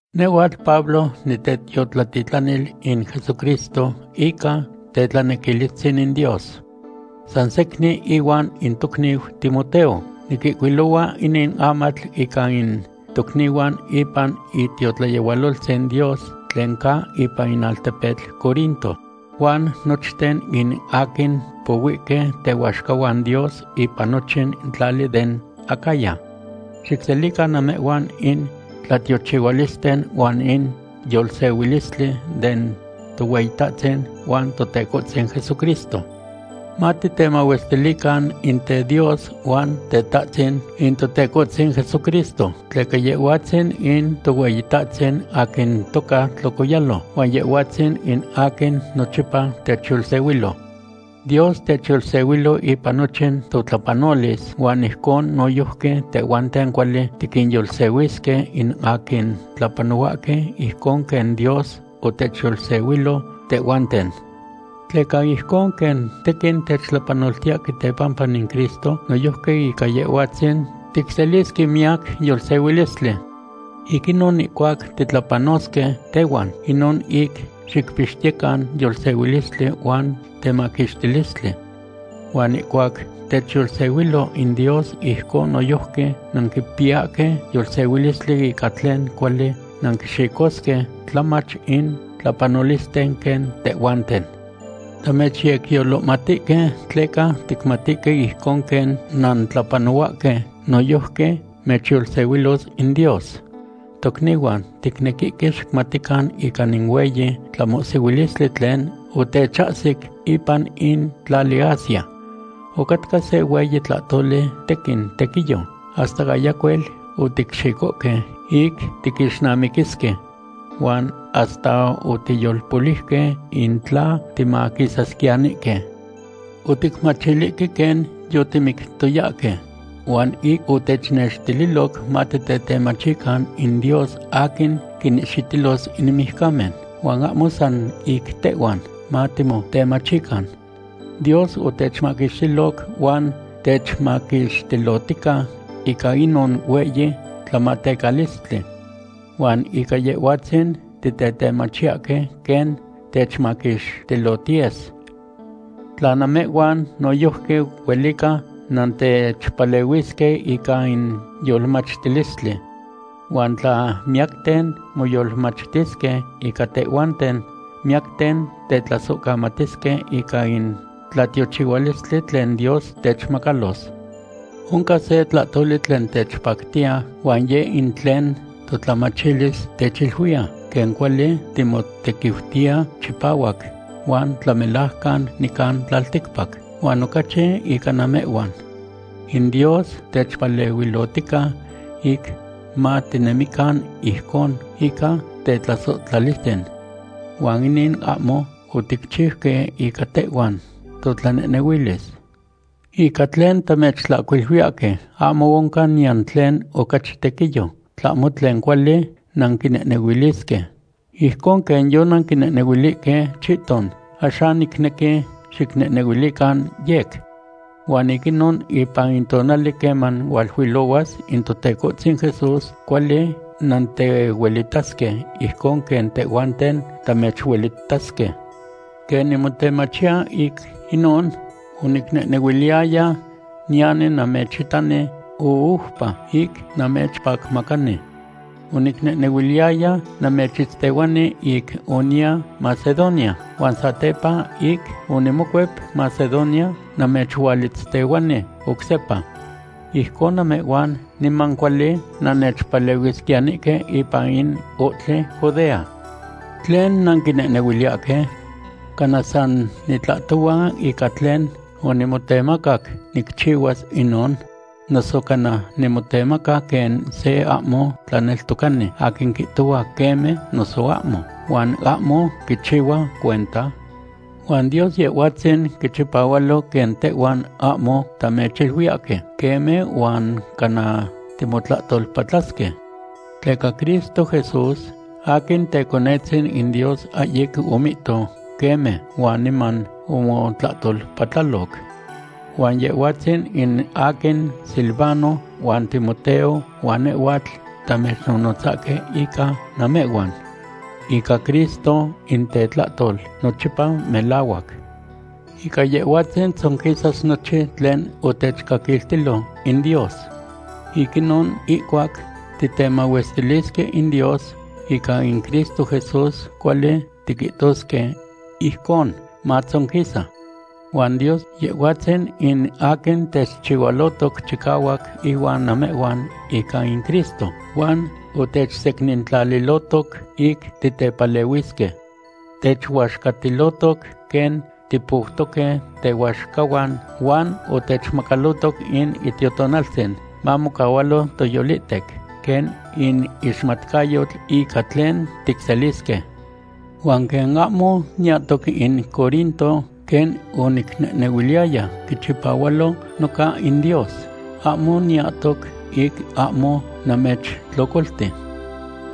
Nehhuatl Pablo nitetiotlatitlanil in Jesucristo ica tetlanequilistzin in Dios. San secnin ihuan in tocniu Timoteo, niquihcuilohua inin amatl ica in tocnihuan ipan itiotlayehualoltzin Dios tlen ca ipan in altepetl Corinto, huan nochten in aquin pohuihque tehuaxcahuan Dios ipan nochin tlali den Acaya. Xicselican namehhuan in tlatiochihualisten huan in yolsehuilistli den Tohueyitahtzin huan Totecohtzin Jesucristo. Matitemahuestilican in teDios huan Tetahtzin in Totecohtzin Jesucristo, tleca Yehhuatzin in Tohueyitahtzin aquin toca tlocoyalo, huan Yehhuatzin in aquin nochipa techyolsehuilo. Dios techyolsehuilo ipan nochin totlapanolis, huan ijcon noyojqui tehhuanten cuali tiquinyolsehuisque in aquin tlapanohuahque ijcon quen Dios otechyolsehuilo tehhuanten. Tleca ijcon quen tequin techtlapanoltiyahque tepampa in Cristo, noyojqui ica Yehhuatzin ticselisque miyac yolsehuilistli. Ic inon, ihcuac titlapanosque tehhuan, inon ic xicpixtiyecan yolsehuilistli huan temaquixtilistli. Huan ihcuac techyolsehuilo in Dios ijcon noyojqui nanquipiyahque yolsehuilistli ica tlen cuali nanquixicosque tlamach in tlapanolisten quen tehhuanten. Tamechyecyolohmatihque tleca ticmatihque ijcon quen nantlapanohuahque, noyojqui mechyolsehuilos in Dios. Tocnihuan, ticnequihque xicmatican ica in hueyi tlamohsihuilistli tlen otechahsic ipan in tlali Asia. Ocatca se hueyi tlahtoli tequin tequiyo, hasta ayacuel oticxicohque ic tiquixnamiquisque. Huan hasta otiyolpoliuque in tla timaquisasquiyanihque. Oticmachilihque quen yotimictoyahque. Huan ic otechnextililoc matitetemachican in Dios aquin quinihxitilos in mijcamen, huan ahmo san ic tehhuan matimotemachican. Dios otechmaquixtiloc huan techmaquixtilotica ica inon hueyi tlamatecalistli. Huan ica Yehhuatzin titetemachiyahque quen techmaquixtilotiyes. Tla namehhuan noyojqui huelica nantechpalehuisque ica in yolmachtilistli. Huan tla miyacten moyolmachtisque ica tehhuanten, miyacten tetlasohcamatisque ica in tlatiochihualistli tlen Dios techmacalos. Oncan se tlahtoli tlen techpactiya huan yeh in tlen totlamachilis techiluiya quen cuali timotequiutiya chipahuac huan tlamelajcan nican tlalticpac, huan ocachi ica namehhuan. In Dios techpalehuilotica ic matinemican ijcon ica tetlasohtlalistzin. Huan inin ahmo oticchiuque ica tehhuan totlanehnehuilis. Ica tlen tamechtlahcuiluiyahque ahmo oncan niyan tlen ocachi tequiyo tlahmo tlen cuali nanquinehnehuilisque. Ijcon quen yonanquinehnehuilihque chihton, axan nicnequi xicnehnehuilican yec. Huan ic inon ipan in tonali queman hualuilohuas in Totecohtzin Jesús, cuali nantechuelitasque ijcon quen tehhuanten tamechuelitasque. Quen nimotemachiya ic inon, onicnehnehuiliyaya niyani namechitani oupa ic namechpacmacani. Onicnehnehuiliyaya namechitztehuani ic oniya Macedonia huan satepa ic onimocuep Macedonia namechualitztehuani oc sepa. Ijcon namehhuan niman cuali nannechpalehuisquiyanihque ipan in ohtli Judea. ¿Tlen nanquinehnehuiliyahque? ¿Cana san nitlahtohua ica tlen onimotemacac nicchihuas inon? ¿Noso cana nimotemaca quen se ahmo tlaneltocani aquin quihtohua “queme” noso “ahmo” huan ahmo quichihua cuenta? Huan Dios Yehhuatzin quichipahualo quen tehhuan ahmo tamechiluiyahque “queme” huan cana timotlahtolpatlasque. Tleca Cristo Jesús, aquin Teconetzin in Dios, ahyic omihto “queme” huan niman omotlahtolpatlaloc. Huan Yehhuatzin in aquin Silvano, huan Timoteo, huan nehhuatl tamechnonotzahque ica namehhuan. Ica Cristo in tetlahtol nochipa melahuac. Ica Yehhuatzin tzonquisas nochin tlen otechcaquiltilo in Dios. Ic inon, ihcuac titemahuestilisque in Dios, ica in Cristo Jesús cuali tiquihtosque “ijcon matzonquisa.” Huan Dios, Yehhuatzin in aquin techchihualotoc chicahuac ihuan namehhuan ica in Cristo, huan otechsecnintlalilohtoc ic titepalehuisque. Techuaxcatilotoc quen tipoutoque tehuaxcahuan huan otechmacalotoc in Itiotonaltzin mamocahualo toyolihtec quen in ixmatcayotl ica tlen ticselisque. Huan quen ayamo niyahtoc in Corinto quen onicnehnehuiliyaya, quichipahualo noca in Dios, ahmo niyahtoc ic ahmo namechtlocolti.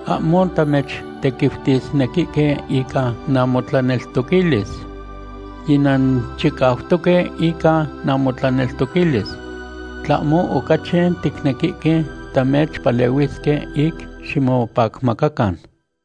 Ahmo tamechtequiutisnequihque ica namotlaneltoquilis. Yinanchicautoque ica namotlaneltoquilis. Tlahmo ocachi ticnequihque tamechpalehuisque ic ximopacmacacan.